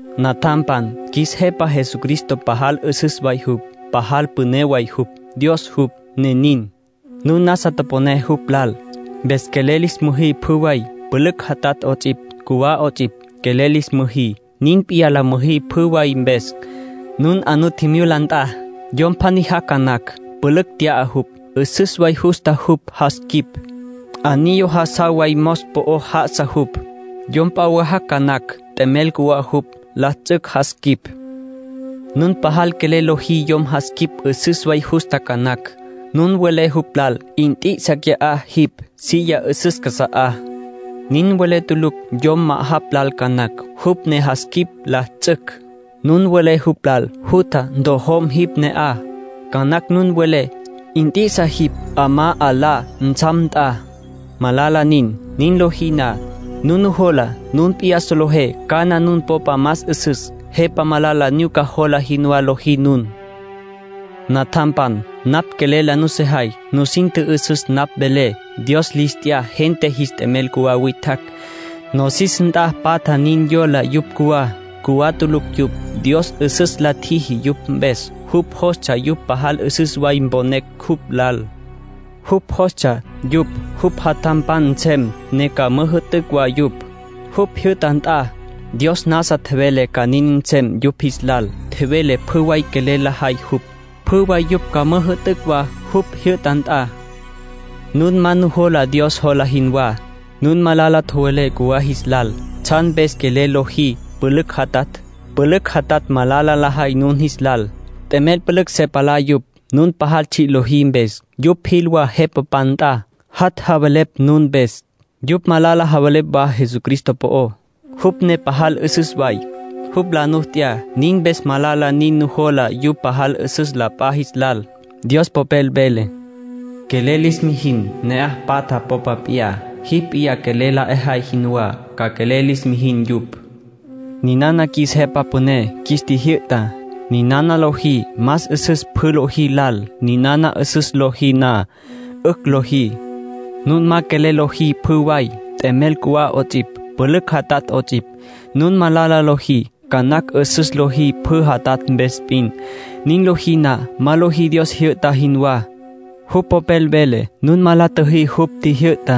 Natjampan, qjuis Jepa Jesucristo pajal 'üsüs way jupj, pajal püné way jupj. Dios jupj, ne nin. Nun nasa toponé jupj lal, mpes quelel lis müjí pjü way, pülücj jatatj 'ots'ipj, cjuwá 'ots'ipj, quelel lis müjí. Nin p'iyá la müjí pjü way mpes. Nun 'a nu tjimyula nt'a, yom pjaní jac' ca nacj, pülücj tya'a jupj. 'Üsüs way justa jupj jas quip. Anillo jas jaw way mos po'o já'asa jupj. Yom p'a wa jac' ca nacj, t'emel cjuwá jupj. La ts'ücj jas quip. Nun pajal quelel lojí yom jas quip 'üsüs way justa ca nacj. Nun welé jupj lal: “Nt'i'isa qui'á jipj, silla 'üsüs casa'á”. Nin welé tulucj yom ma'ajapj lal ca nacj, jupj ne jas quip la ts'ücj. Nun welé jupj lal: “Jutja, ntjojom jipj ne'aj”. Ca nacj nun welé: “Nt'i'isa jipj 'amá 'alá ntsjam nt'a”. Malala nin. Nin lojí na, nun nujola nun p'iyá solejé cana nun popa más 'üsüs. Jepa malala nyuca jola jinwá lojí nun. Natjampan, napj quelel la nusejay. Nusin tjü'üsüs napj velé. Dios lis t'ya gente jis t'emel cjuwá witjacj. Nosis nt'a patja nin yola yupj cjuwá. Cjuwá tulucj yupj. Dios 'üsüs la tjiji yupj mpes. Jupj jostsja yupj pajal 'üsüs way mponecj jupj lal. Jupj jostsja yupj jupj jatjampan nsem, ne ca müjü'tücj wa yupj, jupj jyü'ta nt'a. Dios nasa tjevele ca nin nsem yupj jis lal. Tjevele pjü way quelel lajay jupj, pjü way yupj ca müjü'tücj wa jupj jyü'ta nt'a. Nun ma nujola Dios jola jinwá. Nun malala tjowelé cjuwá jis lal. ¿Tsjan mpes quelel lojí pülücj jatatj? Pülücj jatatj malala lajay nun jis lal. T'emel pülücj se palá yupj, nun pajal tsji' lojí mpes. Yupj jil wa jepapan nt'a, jat' javelepj nun mpes. Yupj malala javelepj wa Jesucristo po'ó, jupj ne pajal 'üsüs way. Jupj la nu t'ya. Nin mpes malala nin nun nujola yupj pajal 'üsüs la p'a jis lal. Dios Popel vele: “Quelel lis mijin ne'aj patja popa p'iyá. Jipj p'iyá quelel la 'ejay jinwá, ca quelel lis mijin yupj.” Ninana qjuis Jepa Püné qjuis tjijyü'ta. Ninana lojí más 'üsüs pjü lojí lal. Ninana 'üsüs lojí na, 'ücj lojí. Nun ma quelel lojí pjü way, t'emel cjuwá 'ots'ipj, pülücj jatatj 'ots'ipj, nun malala lojí. Ca nacj 'üsüs lojí pülücj jatatj mpes p'in. Nin lojí na, ma lojí Dios tjijyü'ta jinwá. Jupj Popel vele nun ma la tjüjí jupj tjijyü'tá.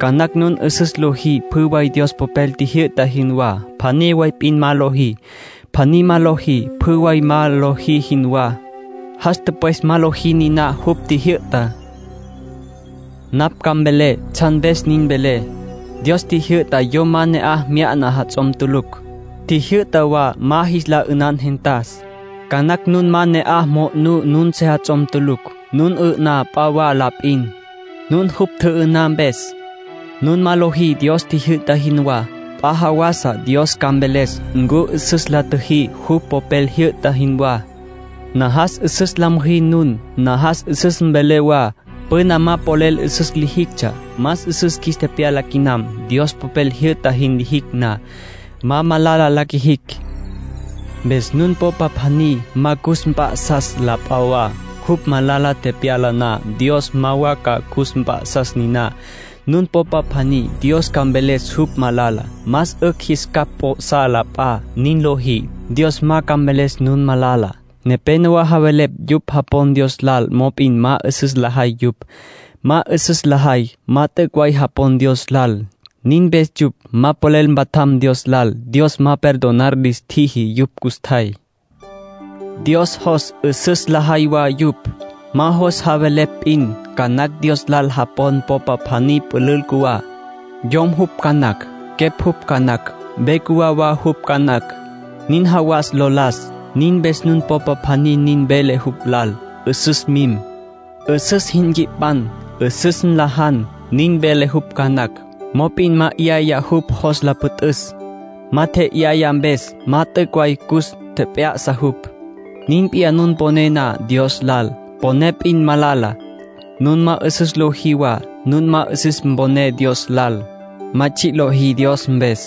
Ca nacj nun 'üsüs lojí pjü way Dios Popel tjijyü'ta jinwá. Pjaní way p'in ma lojí. Pjaní ma lojí, pjü way ma lojí jinwá. Jas tüpwes ma lojí niná jupj tjijyü'tá. Napj ca mvelé tsjan mpes nin velé. Dios tjijyü'ta yom ma ne'aj mya'na jats'om tulucj. Tjijyü'ta wa ma jis la 'ünan gentas. Ca nacj nun ma ne'aj mo'nú nun sejats'om tulucj; nun 'ü'ná p'a wa la p'in. Nun jupj tjü'ü'ná mpes, nun ma lojí Dios tjijyü'ta jinwá. P'a jawasa Dios ca mveles ncu 'üsüs la tjüjí jupj Popel jyü'ta jinwá. Najas 'üsüs la müjí nun. Najas 'üsüs ca mvelé wa. Püna ma polel 'üsüs lijictsja. Más 'üsüs qjuis tepyala quinam. Dios Popel jyü'ta jin lijicj na, ma malala la qjuijicj. Mpes nun popa pjaní ma cus tjep'ya'sa la p'a wa, jupj malala tepyala na, Dios ma wa ca cus mp'a'sas niná, nun popa pjaní. Dios ca mveles jupj malala. Más 'ücj jis capj p'o'sá la p'a. Nin lojí, Dios ma ca mveles nun malala. Nepénowa javelepj yupj japon Dios lal, mop'in ma 'üsüs lajay yupj. Ma 'üsüs lajay, ma t'üc' way japon Dios lal. Nin mpes yupj ma polel mpatjam Dios lal. Dios ma perdonar lis tjiji yupj custjay. Dios jos 'üsüs lajay wa yupj. Ma jos javelepj p'in. Ca nacj Dios lal japon popa pjaní pülül cjuwá. Yom jupj ca nacj, quepj jupj ca nacj. Ve cjuwá wa jupj ca nacj, nin jawas lo las. Nin mpes nun popa pjaní nin vele jupj lal: “'Üsüs mim. 'Üsüs jin nqui'pan. 'Üsüs nlajan.” Nin vele jupj ca nacj, mop'in ma 'yaya jupj jos la püt'üs. Ma tje'yaya mpes ma t'üc' way cus tjep'ya'sa jupj. Nin p'iyá nun poné na Dios lal. Poné p'in malala. Nun ma 'üsüs lojí wa, nun ma 'üsüs poné Dios lal. Ma tsji' lojí Dios mpes.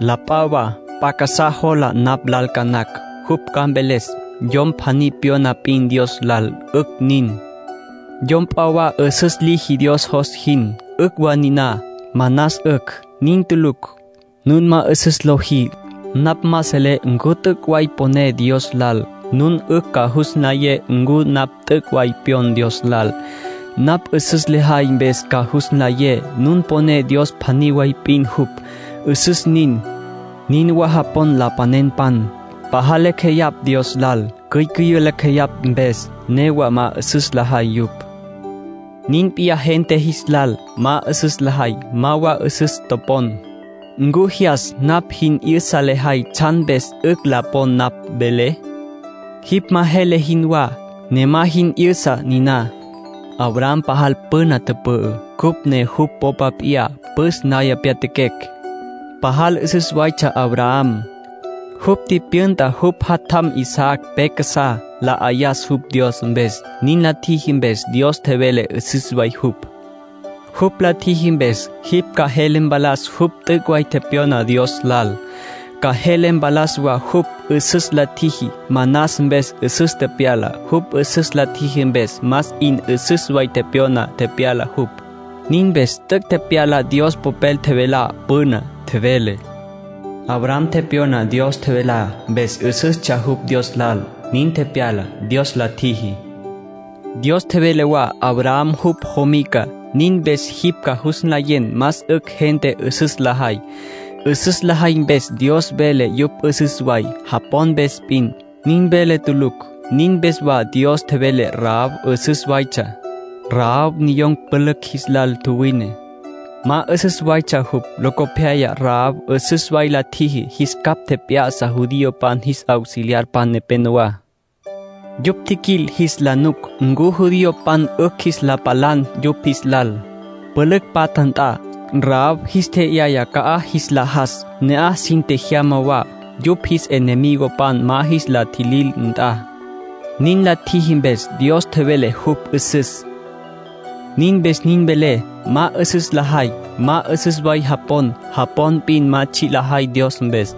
La p'a wa p'a casá jola napj lal ca nacj. Jupj ca mveles: “Yom pjaní pyona p'in Dios lal, 'ücj nin. Yom p'a wa 'üsüs liji Dios jos jin, 'ücj wa niná. Manas 'ücj.” Nin tulucj. Nun ma 'üsüs lojí, napj ma selé ncu t'üc' way poné Dios lal. Nun 'ücj ca jus nlayé ncu napj t'üc' way pyon Dios lal. Napj 'üsüs lejay mpes ca jus nlayé. Nun poné Dios pjaní way p'in jupj. 'Üsüs nin. Nin wa japon lapanenpan. Pajal lacj jeyapj Dios lal. Cyücüyün̈ lacj jeyapj mpes. Newa ma 'üsüs lajay yupj. Nin p'iyá gente jis lal. Ma 'üsüs lajay, ma wa 'üsüs topon. ¿Ncu jyas napj jin 'yüsa lejay tsjan mpes 'ücj la pon napj velé? Jipj ma jele jinwá, ne ma jin 'yüsa niná. Abraham pajal püna tüpü'ü, cupj ne jupj popa p'iyá püs naya pyatjaquecj. Pajal 'üsüs waytsja Abraham. Jupj tipyünta jupj jatjam Isaac pe casá, la 'ayas jupj Dios mpes. Nin la tjiji mpes, Dios tjevele 'üsüs way jupj. Jupj la tjiji mpes, jipj ca jele mpalas jupj t'üc' way tepyona Dios lal. Ca jele mpalas wa jupj 'üsüs la tjiji. Manas mpes 'üsüs tepyala. Jupj 'üsüs la tjiji mpes, más 'in 'üsüs way tepyona tepyala jupj. Nin mpes t'üc' tepyala Dios Popel tjevelá püná. Tjevele: “Abraham tepyona Dios tjevelá. Mpes 'üsüstsja jupj Dios lal; nin tepyala, Dios la tjiji.” Dios tjevele wa Abraham jupj jomica. Nin mpes jipj ca jus nlayen más 'ücj gente 'üsüs lajay. 'Üsüs lajay mpes Dios vele yupj 'üsüs way. Japon mpes p'in, nin vele tulucj. Nin mpes wa Dios tjevele Rahab 'üsüs waytsja. Rahab niyom pülücj jis lal tjuwine. Ma 'üsüs waytsja jupj. Locopyaya Rahab 'üsüs way la tjiji. Jis capj tjep'ya'sa judiopan jis auxiliarpan nepenowá. Yupj tjiquil jis la nuc ncu judiopan 'ücj jis la palan yupj jis lal, pülücj patja nt'a. Rahab jis tje'yaya ca'aj jis la jas. Ne'aj sin tjejyama wa, yupj jis enemigopan ma jis la tjilil nt'a. Nin la tjiji mpes, Dios tjevele jupj 'üsüs. Nin mpes nin velé. Ma 'üsüs lajay, ma 'üsüs way japon. Japon p'in ma tsji' lajay Dios mpes.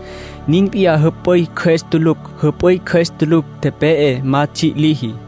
Nin p'iyá jüp'üy cjües tulucj. Jüp'üy cjües tulucj, tepe'e. Ma tsji' liji.